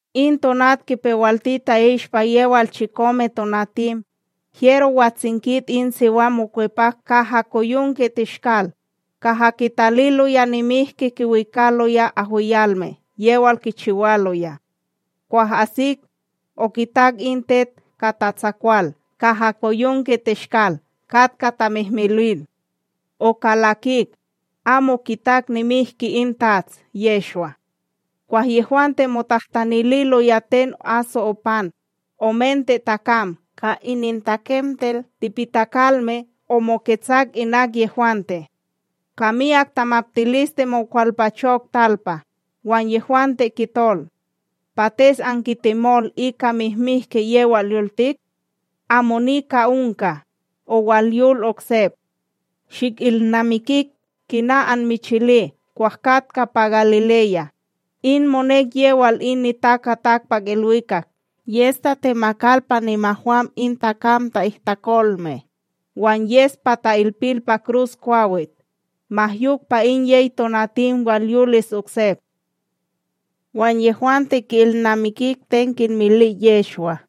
In tonat kipewalti ta'ishpa yewal chikomeTonatim, hyero watsinkit in siwam mokwepak kahakoyonkeTeshkal, kaha kitaliloya nimihki kiwikaloya ahwiyalme; yewal kichiwaloya. Kwah asik, okitak in tet ka tatsakwal kahakoyonkeTeshkal katka tamihmilwil; okalakik, amo kitak nimihki in TATS Yehshwa. Kwah yehwante motahtanililoya, ten aso opan, omente takam ka inintakemtel tipitakalme omoketsak inak yehwante. Ka miyak tamaptiliste mokwalpachok talpa, wan yehwante kitol: ―Pates ankitemol ika mihmihki yewal yoltik? Amo nika onka, owalyol oksep. Shikilnamikik kina anmichili kwah katka pa Galileya, in monek yewal in NitakaTakpakIlwikak yes tatemakal pa nimahwam in takam ta'ihtakolme, wan yes pa ta'ilpil pa kruskwawit, ma yok pa in yey tonatim walyolis oksep. Wan yehwante ki'ilnamikik ten kinmili Yehshwa,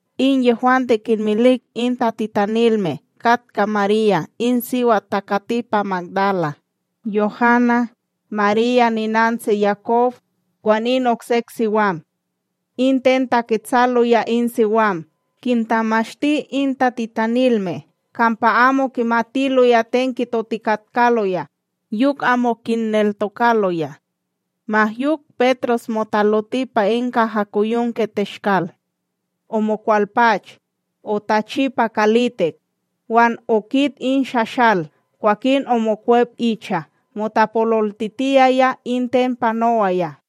In yehwante kinmilik in tatitanilme katka Marya in siwat takati pa Magdala, Yohana, Marya ninantsi Yakob, wan in oksek siwam. In ten taketsaloya in siwam kintamashti in tatitanilme kampa amo kimatiloya ten kitotikatkaloya, yok amo kinneltokaloya. Ma yok, Petros motaloti pa in kahakoyonkeTeshkal; omokwalpach, otachi pa kalitik, wan okit in shashal kwakin omokwep icha motapololtitiyaya in ten panowaya.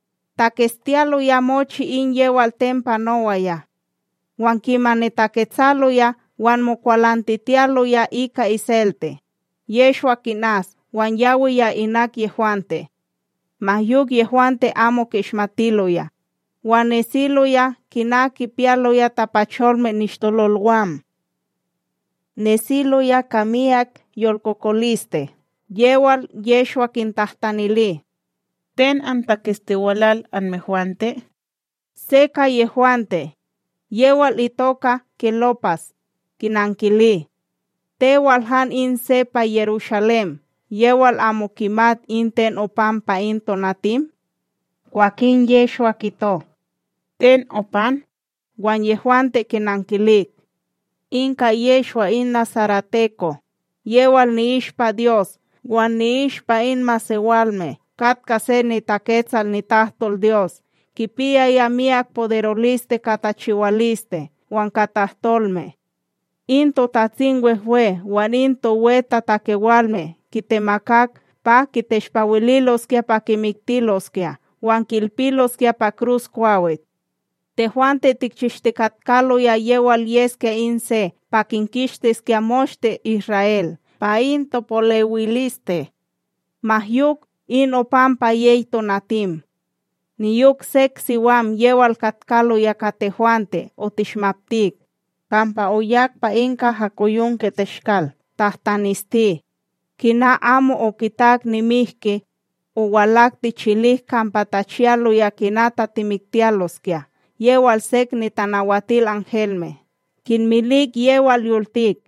Taketstiyaloya mochi in yewal ten panowaya; wan kimani taketsaloya wan mokwalantitiyaloya ika iselte, Yehshwa kinas wan yawiya inak yehwante. Ma yok yehwante amo ki'ishmatiloya, wan nesiloya kina kipiyaloya tapacholme nishtololwam. Nesiloya ka miyak yolkokoliste yewal Yehshwa kintahtanili: ―Ten antaketstiwalal anmehwante? Se ka yehwante, yewal itoka Kelópas, kinankili: ―Tewal han in se pa Yerushalém yewal amo kimat in ten opan pa in tonatim? Kwakin Yehshwa kito: ―Ten opan? Wan yehwante kinankilik: ―In ka Yehshwa in nasareteko, yewal ni'ishpa Dyos wan ni'ishpa in masewalme katka se niTaketsal nitahtolDyos kipiyaya miyak poderoliste ka tachiwaliste wan ka tahtolme; In TotatsimWehwe wan in towetatakewalme kitemakak pa kiteshpawililoskya pa kimiktiloskya wan ki'ilpiloskya pa kruskwawit. Tehwante tikchishtikatkaloya yewal yeskya in se pa kinkishtiskya moshte Isra'El pa in topolewiliste. Ma yok, in opan pa yey tonatim. Niyok sek siwam yewal katkaloya ka tehwante otishmaptik, kampa oyak pa in kahakoyonkeTeshkal tahtanesti, kina amo okitak nimihki, owalak tichilik kampa tachiyaloya kina tatimiktiyaloskya yewal sek nitanawatilanhelme kinmilik yewal yoltik.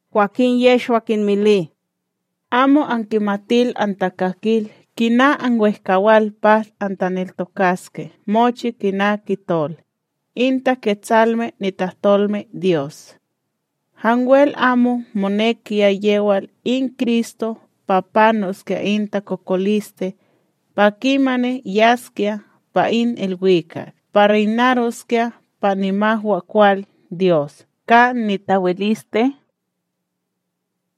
Kwakin Yehshwa kinmili: ―Amo ankimatil antakakil kina anwehkawal pa antaneltokaske mochi kina kitol, in Taketsalme nitahtolmeDyos! Hanwel amo monekiya yewal in Kristo pa panoskya in takokoliste pa kimani yaskya pa in ilwikak pa reynaroskya pa nimahwakwalDyos ka nitawiliste?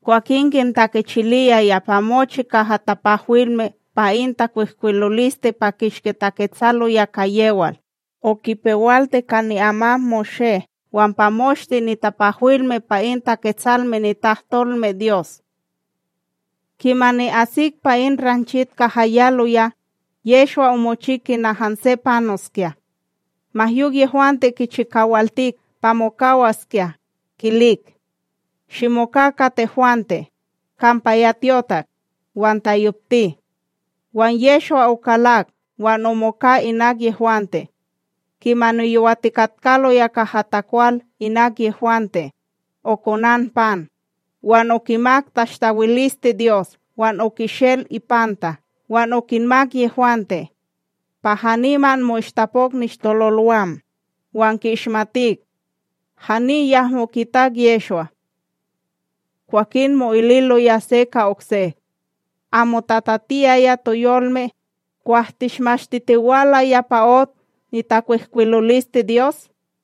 Kwakin kintakechiliyaya pa mochi kaha tapahwilme pa in takwihkwiloliste pa kishki taketsaloya ka yewal, okipewalti ka ni'amam Moshé wan pa moshte nitapahwilme pa in Taketsalme nitahtolmeDyos. Kimani asik pa in ranchit kaha yaloya, Yehshwa omochi kina hanse panoskya. ma yok yehwante kichikawaltik pa mokawaskya, kilik: ―Shimoka ka tehwante, kampa ya tyotak, wan tayopti. Wan Yehshwa okalak wan omoka inak yehwante. Kimani yowatikatkaloya kaha takwal inak yehwante, okonan pan, wan okimak tashtawiliste Dyos, wan okishel ipanta wan okinmak yehwante. Pa haniman mo'ishtapok nishtololwam, wan ki'ishmatik; hani yahmo kitak Yehshwa. Kwakin mo'ililoya se ka okse: ―Amo tatatiyaya toyolme, kwah tishmashtitiwalaya pa ot nitakwihkwilolisteDyos?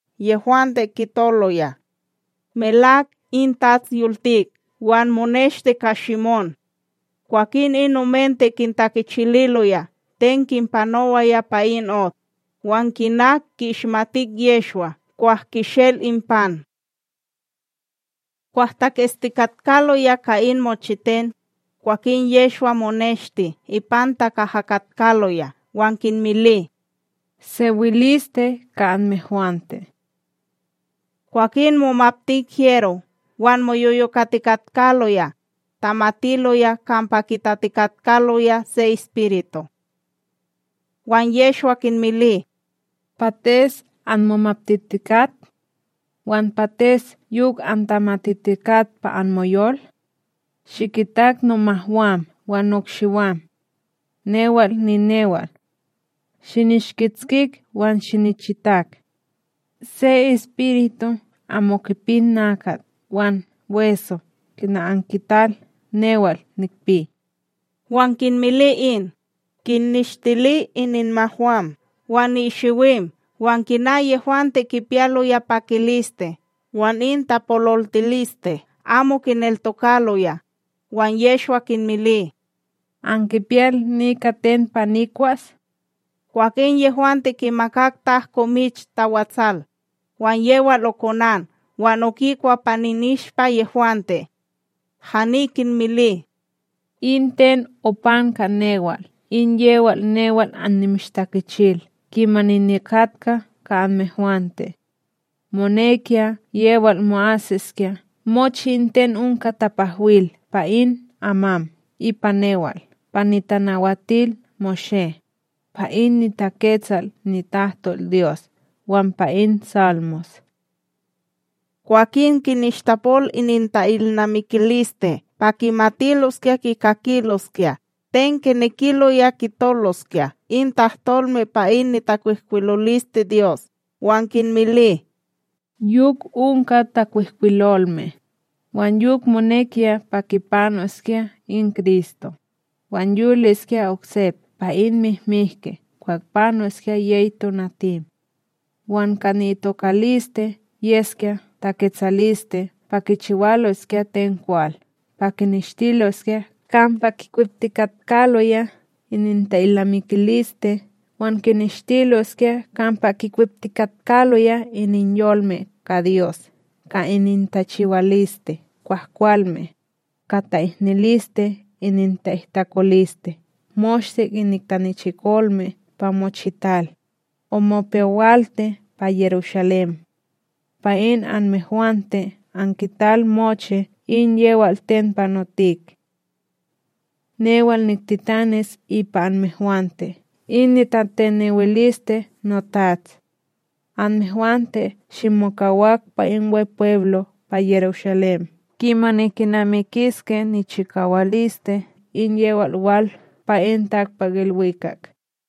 Yehwante kitoloya: ―Melak in TATS yoltik, wan moneshti ka Shimón. Kwakin in omente kintakichililoya ten kinpanowaya pa in ot, wan kina ki'ishmatik Yehshwa kwah kishel in pan. Kwah taketstikatkaloya ka in mochiten, kwakin Yehshwa moneshti ipanta kaha katkaloya wan kinmili: ―Sewiliste ka anmehwante. Kwakin momaptik hyero wan moyoyokatikatkaloya, tamatiloya kampa kitatikatkaloya se espiritu. Wan Yehshwa kinmili: ―Pates anmomaptitikat? Wan pates yok antamatitikat pa anmoyol? Shikitak nomahwam wan nokshiwam. Newal ninewal. Shinishkitskik wan shinichitak; se espiritu amo kipi nakat wan weso kina ankital newal nikpi. Wan kinmili in, kinnishtili ininmahwam wan nikshiwim. Wan kina yehwante kipiyaloya pakiliste wan in tapololtiliste amo kineltokaloya, wan Yehshwa kinmili: ―Ankipiyal nika ten pa nikwas? Kwakin yehwante kimakak tahko mich tawatsal, wan yewal okonan wan okikwa pa ininishpa yehwante. Hani kinmili: ―In ten opan ka newal in yewal newal annimishtakichil kimani nikatka ka anmehwante: monekiya yewal mo'asiskya mochi in ten onka tapahwil pa in amam ipa newal pa NitanawatilMoshé, pa in niTaketsal nitahtolDyos wan pa in Salmos. Kwakin kinishtapol ininta'ilnamikiliste pa kimatiloskya kikakiloskya ten kinekiloya kitoloskya in tahtolme pa in nitakwihkwilolisteDyos, wan kinmili: ―Yok onka takwihkwilolme, wan yok monekiya pa kipanoskya in Kristo, wan yoliskya oksep pa in mihmihki kwah panoskya yey tonatim; wan ka ni'itokaliste yeskya taketsaliste pa kichiwaloskya ten kwal pa kineshtiloskya kampa kikweptikatkaloya ininta’ilnamikiliste wan kineshtiloskya kampa kikweptikatkaloya ininyolme ka Dyos ka inintachiwaliste kwahkwalme, ka ta'ihniliste ininta'ihtakoliste moshte inik tanichikolme pa mochital, omopewalti pa Yerushalém. Pa in anmehwante ankital mochi in yewal ten panotik. Newal niktitanis ipa anmehwante in nitateniwiliste notats; anmehwante shimokawak pa in Wepweblo pa Yerushalém kimani kinamikiske nichikawaliste in yewal wal pa in takpakIlwikak.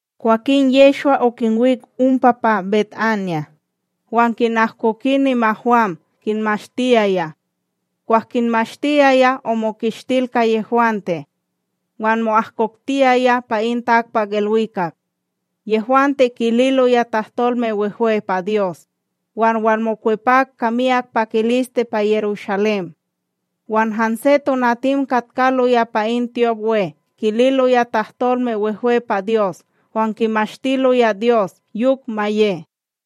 Kwakin Yehshwa okinwik ompa pa BetAnya, wan kinahkoki nimahwam kinmashtiyaya. Kwah kinmashtiyaya, omokishtil ka yehwante wan mo'ahkoktiyaya pa in takpakIlwikak. Yehwante, kililoya tahtolme wehwe pa Dyos, wan walmokwepak ka miyak pakiliste pa Yerushalém, wan hanse tonatim katkaloya pa in tyopWe kililoya tahtolme wehwe pa Dyos wan kimashtiloya Dyos. Yok ma ye.